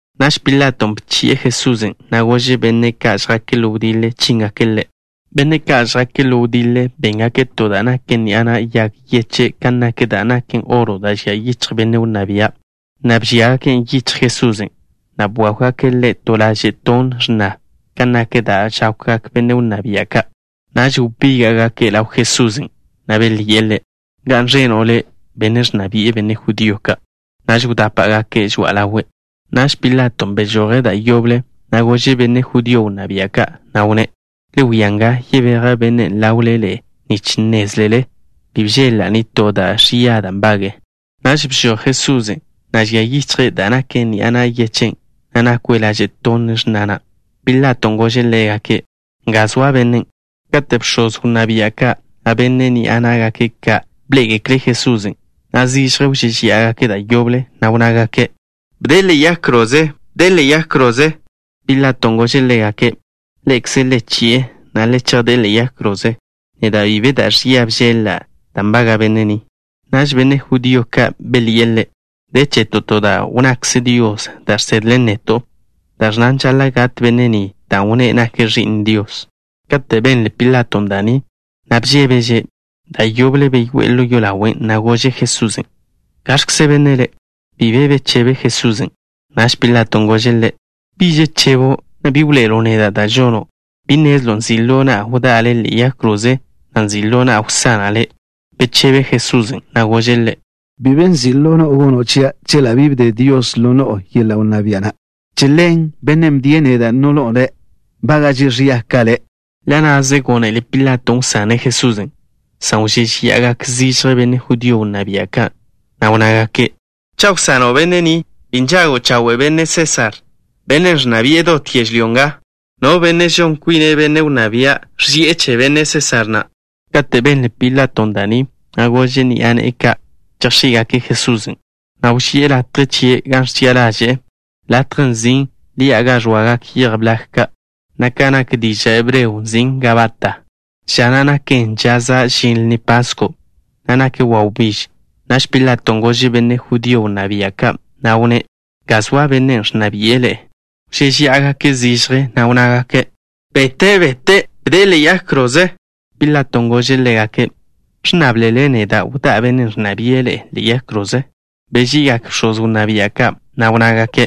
Naž Pilaton' bchi'e Jesusen', na' gože' benne' ka' žjake' ḻo wdiḻe chíngake' Ḻe'. Benne' ka' žjake' ḻo wdiḻe béngake' to da' naken ni'a na' yag yeche' kan nak da' naken oro da' žia yichj benne' wnná bia', na' bžíagaken' yichj Jesusen', na' bwákwgake' Ḻe' to laže' tonn x̱na kan nak da' žákwgak benne' wnná bia' ka'. Naž wbíga'gake' ḻaw Jesusen', na' belyi'e Ḻe': —¡Ga'n ẕeno' le', benne' ẕnna bi'e benne' judío ka'! Naž wdápa'gake' žoa'a ḻawe'. Naž Pilaton' bežoje' da' yoble, na' gože' benne' judío wnná bia' ka', na' wnné': —Le wia nga, yebeja' bennen' ḻawle ḻe'e nich nnézlele bi bžeḻ-la' nitó da' ẕia da' nbage'e. Naž bžoj Jesusen', na' žia yichje' da' naken ni'a na' yag yechen', na' nakwe' laže' tonn x̱na na'. Pilaton' gože' ḻégake': —Nga zoa bennen'. Kate' bx̱oz wnná bia' ka', na' benne' ni'a ná'gake' ka' bḻé'egekle' Jesusen', zižje wžéžeya'agake' da' yoble, na' wnnágake': —¡Bde'e ḻe'e yag kroze! ¡Bde'e ḻe'e yag kroze! Pilaton' gože' ḻégake': —Ḻe'ekze le chi'e, na' le chejdé'e ḻe'e yag kroze. Neda' bi be da' ẕia bžeḻ-la' da' nbaga' benne' ni. Naž benne' judío ka' belyi'e ḻe': —De cheto' to da' wnnakze Dios da' žsedlen neto', da' ẕnnan žaḻa' gat benne' ni dan' wnné' nake' Ẕi'n Dios. Kate' benle Pilaton' da' ni, bžébeže'. Da' yoble beyoé'e ḻo yolawen', na' gože' Jesusen': —¿Gaẕkze benne' Le'? Bi be bechebe Jesusen'. Naž Pilaton' gože' Ḻe': —¿Bi žechebo', na' bi wḻoe'elo' neda' da' žono'? ¿Bi nnezlo' nzi' ḻo na'a wdá'a Le' ḻe'e yag kroze, na' nzi' ḻo na'a wsana' Le'? Bechebe Jesusen', na' gože' ḻe': —Bi be nzi' ḻo no'o gono' chia' chela' bi bde Dios ḻo no'o yeḻa' wnná bia' na'. Che ḻen, bennen' bdie' neda' ḻo no'o nbága'že' ẕia ka le'. Ḻa' na'ze gónele Pilaton' wsane' Jesusen', san wžéžeya'agak benne' judío wnná bia' ka', na' wnnágake': —Cha' wsano' benne' ni, bi nžago' chawe' benne' Sésar, bennen' ẕnna bi'e dot yežlyó nga. No benne' žon kwine' benne' wnná bia', ẕži'e che benne' Sésar na'. Kate' benle Pilaton' da' ni, gože' ni'a ne'e ka' chejx̱í'gake' Jesusen', na' wži'e latje chie' gan ẕchi'a ḻaže'e, latjen' nzin' Ḻi'a Ga Ẕoagak Yej Blag Ka', na' ka nak diža' hebreo nzin' Gabata. Ža na' naken ža za' žin Lni Pasko', na' nak wawbíž. Naž Pilaton' gože' benne' judío wnná bia' ka', na' wnné': —Nga zoa bennen' ẕnna bi'e ḻe'e. Wžéžeya'agake' zižje, na' wnnágake': —¡Bete'! ¡Bete'! ¡Bde'e ḻe'e yag kroze! Pilaton' gože' ḻégake': —¿Ẕnnáblele neda' wdá'a bennen' ẕnna bi'e ḻe'e ḻe'e yag kroze? Beži'igak bx̱oz wnná bia' ka', na' wnnágake':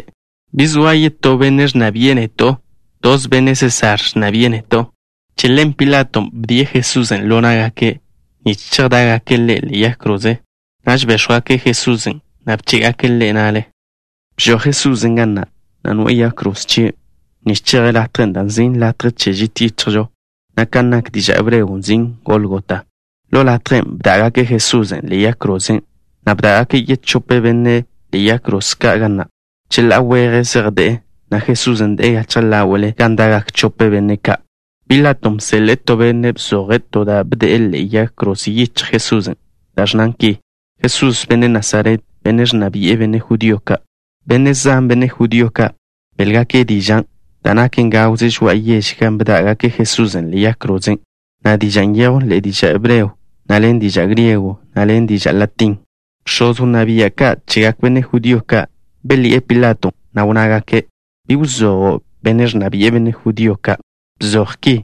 —Bi zoa yetó benne' ẕnna bi'e neto'. Toze benne' Sésar ẕnna bi'e neto'. Che ḻen Pilaton' bdie' Jesusen' ḻo ná'gake', nich chejdá'gake' Ḻe' ḻe'e yag kroze. Naž béx̱wgake' Jesusen', na' bché'gake' Ḻe' na'le. Bžoj Jesusen' ga na', na' noe'e yag kroze chie', nich cheje' latjen' dan' nzin' Latje Che Žit Yichjžo, na' kan nak diža' hebreo nzin' Gólgota. Ḻo latjen' bdá'gake' Jesusen' ḻe'e yag krozen', na' bdá'gake' yechope benne' ḻe'e yag kroze ka' ga na'. Cheḻá'a weje zej de'e, na' Jesusen' de'e gachje ḻáwe'le gan da'gak chope benne' ka'. Pilaton' bseḻe'e to benne' bzoje' to da' bde'e ḻe'e yag kroze yichjle Jesusen', da' ẕnnan ki: “Jesús, benne' Nasaret, benne' ẕnna bi'e benne' judío ka'.” Benne' zan, benne' judío ka', beḻgake' dižan', dan' naken gawze žoa'a yež gan bdá'gake' Jesusen' ḻe'e yag krozen', na' dižan' nyejwn ḻen diža' hebreo, na' ḻen diža' griego, na' ḻen diža' latín. Bx̱oz wnná bia' ka' chegak benne' judío ka' belyi'e Pilaton', na' wnnágake': —Bi wzojo': “Benne' ẕnna bi'e benne' judío ka'.” Bzoj ki: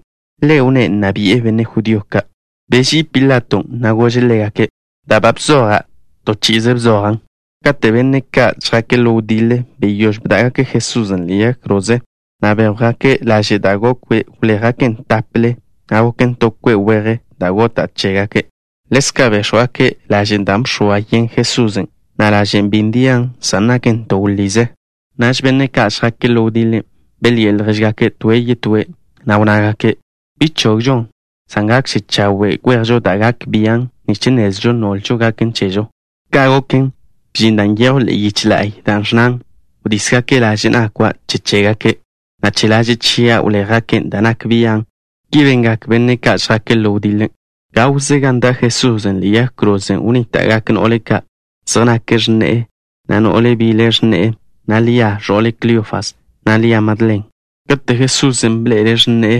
“Ḻe' wnné' nna bi'e benne' judío ka'.” Beží'i Pilaton', na' gože' ḻégake': —Da' ba bzoja', to chi'ize bzojan'. Kate' benne' ka' žjake' ḻo wdiḻe, beyóž bdá'gake' Jesusen' ḻe'e yag krozen', na' béx̱wgake' laže' da' gokwe'. Wléjgaken' tápele, na' goken to kwe' weje da' gota' che chégake'. Ḻezka' béx̱wgake' lažen' da' bx̱oa yen Jesusen', na' lažen' bi ndian, san naken to wḻize. Naž benne' ka' žjake' ḻo wdiḻe, belyi'e ljéžgake' toe' yetóe', na' wnnágake': —Bi chogžon, san gakže chawe' kwejžo da' gak bian', nich nnezlžo nolžo gaken chežo. Ka' goken, bžin dan' nyejw ḻe'e yiche la'y, da' ẕnnan: Wdísgake' laže' nakwa' che chégake', na' che laže' chia' wléjgake' da' nak bian'. Ki bengak benne' ka' žjake' ḻo wdiḻe. Gawze gan da' Jesusen' ḻe'e yag krozen' wnníta'gak no'le ka'. Zej nake' x̱ne'e, na' no'le bile x̱ne'e, na' Lia, ẕo'le Kleofas, na' Lia Madlen. Kate' Jesusen' bḻe'ele' x̱ne'e,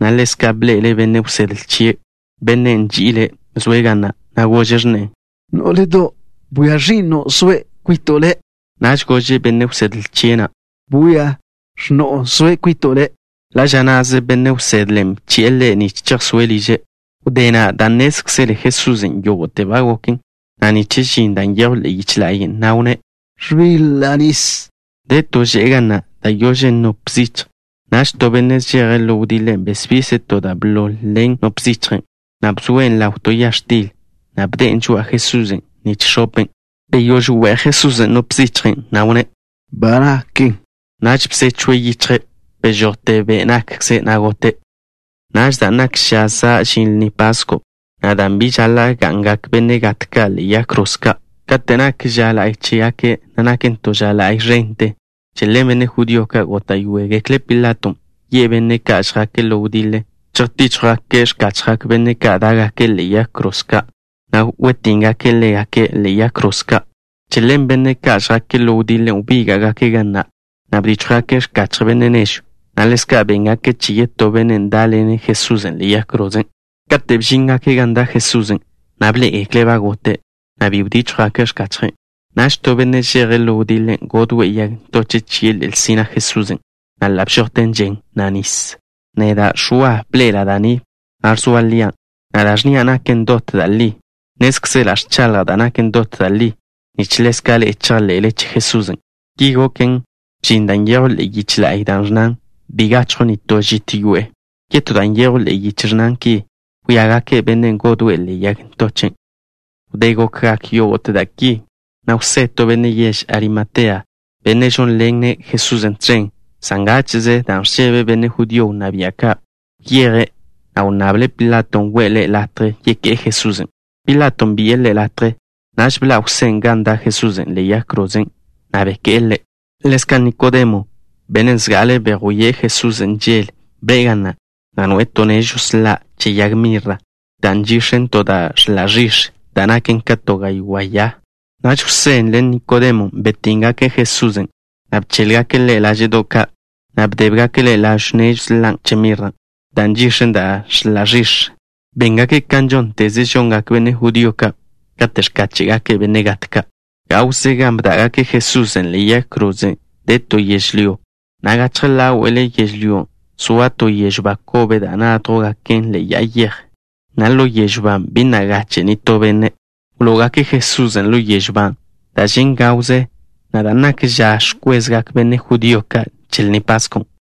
na' ḻezka' bḻe'ele' benne' wsedle chie', bennen' nži'ile', zoe' ga na', gože' x̱ne'e: —Nó'ledo', bwia ẕi'no' zoe' kwito' le'. Naž gože' benne' wsedle chie' na': —Bwia, x̱no'o zoe' kwito' le'. Ḻa' ža na'ze benne' wsedlen' bchi'e ḻe' nich chejsóe' liže'. Wdé na', dan' nnézkzele Jesusen' yógo'te ba goken, na' nich žin da' nyejw ḻe'e yiche la'y, wnné': —Ẕbiḻa' nis. De to že'e ga na', da' yožen nop zichj. Naž to benne' žeje' ḻo wdiḻe besbise' to da' bḻol ḻen nop zichjen', na' bzoen' ḻaw to ya x̱til, na' bde'en žoa'a Jesusen' nich x̱open'. Beyóž we'j Jesusen' nop zichjen', na' wnné': —Ba nakten. Naž bzechwe' yichje'. Bežojte be' nakkze', na' gote'. Naž, dan' nak ža za' žin Lni Pasko', na' dan' bi žaḻa' ga'ngak benne' gat ka' ḻe'e yag kroze ka' kate' nak ža la'y chégake', na' naken to ža la'y ẕente, che ḻen benne' judío ka' góta'yoegekle' Pilaton' yi'e benne' ka' žjake' ḻo wdiḻe, chejtíchjwgake' x̱kachjgak benne' ka' dá'gake' ḻe'e yag kroze ka', na' wetíngake' ḻégake' ḻe'e yag kroze ka'. Che ḻen benne' ka' žjake' ḻo wdiḻe wbíga'gake' ga na', na' bdíchjwgake' x̱kachje benne' nežw, na' ḻezka' béngake' che yetó bennen' dá'ḻene' Jesusen' ḻe'e yag kroze. Kate' bžíngake' gan da' Jesusen', bḻé'egekle' ba gote', na' bi bdíchjwgake' x̱kachje'. Naž to benne' žeje' ḻo wdiḻe godwe' yag ntoche' chie' ḻe'el sina' Jesusen', na' ḻa' bžojte žen, na' nis. Neda', Ẕwa, bḻe'ela' da' ni, na' ẕzoa lian', na' da' ẕnnia' naken dot da' li. Nnézkzela' ẕchaḻja' da' naken dot da' li, nich ḻezka' ḻe'e chejḻe'le che Jesusen'. Ki goken, bžin da' nyejw ḻe'e yiche la'y, da' ẕnnan: “Bi gachjw nitó žit yoe'e.” Yetó da' nyejw ḻe'e yiche ẕnnan ki: “Wíagake' bennen' godwe' Ḻe' yag ntoche'.” Wdé gokgak yógo'te da' ki, Jwsé, to benne' yež Arimatea, benne' žónḻene' Jesusen' tẕen, san ngáche'ze dan' ẕžebe' benne' judío wnná bia' ka', wyeje', na' wnnable' Pilato we'e ḻe' latje yeké'e Jesusen'. Pilaton' bi'e ḻe' latje. Naž bḻa' Jwsén' gan da' Jesusen' ḻe'e yag krozen', na' beké'e Ḻe'. Ḻezka' Nikodemo, bennen' zga'ale bejwíe' Jesusen' žel, bḻe'e ga na', na' noe'e to nežw sḻa' che yag mirra, da' nchix̱en to da' ẕḻa' ẕix̱, da' naken ka to gaywá' ya. Naž Jwsén' ḻen Nikodemon' betínngake' Jesusen', na' bchéḻgake' Ḻe' láže'do' ka', na' bdébgake' ḻawn nežw sḻan' che mirra, da' nchix̱en da' ẕḻa' ẕix̱. Béngake' kan žónteze žongak benne' judío ka' kate' ẕkáche'gake' benne' gat ka'. Gawze gan bdá'gake' Jesusen' ḻe'e yag kroze de to yežlyó, na' gachje ḻáwe'le yežlyón' zoa to yežw ba kobe da' nádjwgaken' ḻe'e ya'a yej, na' ḻo yežw ban' bi na' gache' nitó benne'. Wló'ogake' Jesusen' ḻo yežw ban' dan' žen' gawze, na' dan' nak ža ẕkwezgak benne' judío ka' che Lni Paskon'.